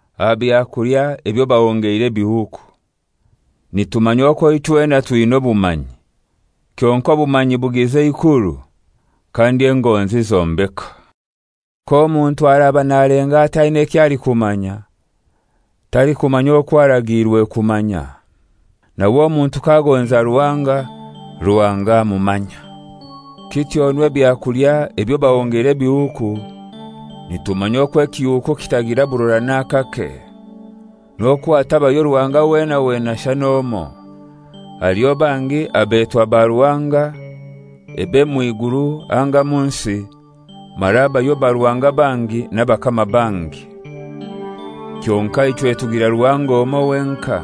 Aha byakulya ebyo bahongeire ebihuuku: Nitumanya okwo ichwena twina obumanyi. Kyonkai obumanyi bugiza eikuru, kandi engonzi zombeka. K'omuntu araba nalenga ati aina eky'alikumanya, talikumanya okwo aragiirwe kumanya. Nawe omuntu k'agonza Ruhanga, Ruhanga amumanya. Kityonu ebyakulya ebyo bahongeire ebihuuku, nitumanya okwo ekihuuku kitagira burora n'akake, n'okwo hatabayo Ruhanga wena wena shana omoi. Haliho bangi abetwa baruhanga, ebe mw'iguru anga mu nsi, mara habayo baruhanga bangi n'abakama bangi. Kyonkai ichwe tugira Ruhanga omoi wenkai,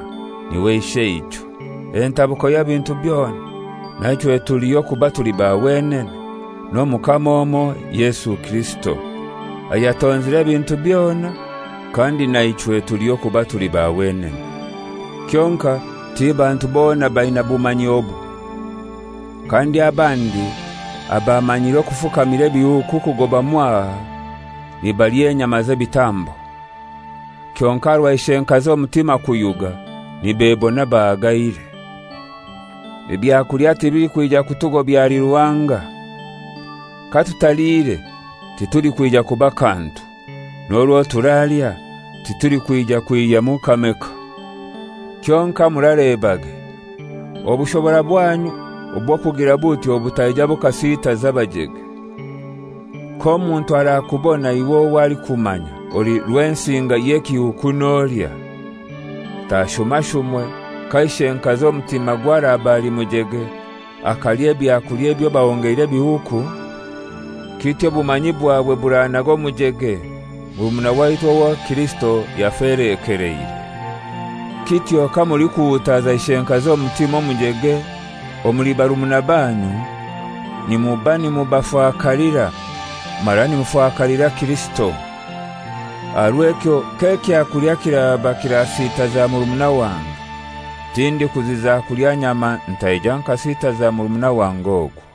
n'iwe Isheichwe, entabuko y'ebintu byona, na ichwe tuliho kuba tuli ba wenene, n'Omukama omoi Yesu Kirisito, ayatonzire ebintu byona, kandi na ichwe tuliho kuba tuli ba wenene. Kyonkai ti bantu bona baina bumanyi obu. Kandi abandi abamanyire okufukamira ebihuuku kugoba mwaha, nibalya enyama z'ebitambo; kyonkai aha rwa ishenkazi omutima kuyuga, nibebona bahagaire. Ebyakulya tibilikwija kutugobya ahali Ruhanga. Katutaliire titulikwija kuba kantu, n'orwo turalya titulikwija kwihyamu kameka. Kyonkai muralebage, obushobora bwanyu obw'okugira butyo butaija bukasiitaza abajege. K'omuntu arakubona iwe owo alikumanya, oli rwensinga y'ekihuuku nolya, tashumashumwe, ka ishenkazi omutimagwe araba ali mujege, akalya ebyakulya ebyo bahongeire ebihuuku? Kityo obumanyi bwawe buranaga omujege, murumuna waitu owo Kirisito yafelekeleire. Kityo kamulikuhuutaza ishenkazi omutima omujege omuli barumuna banyu nimuba nimubafakalira, mara nimufakalira Kirisito. Aha rw'ekyo k'ekyakulya kiraba kirasitaza murumuna wange, tindikuziza kulya nyama ntaija nkasitaza murumuna wange ogwo.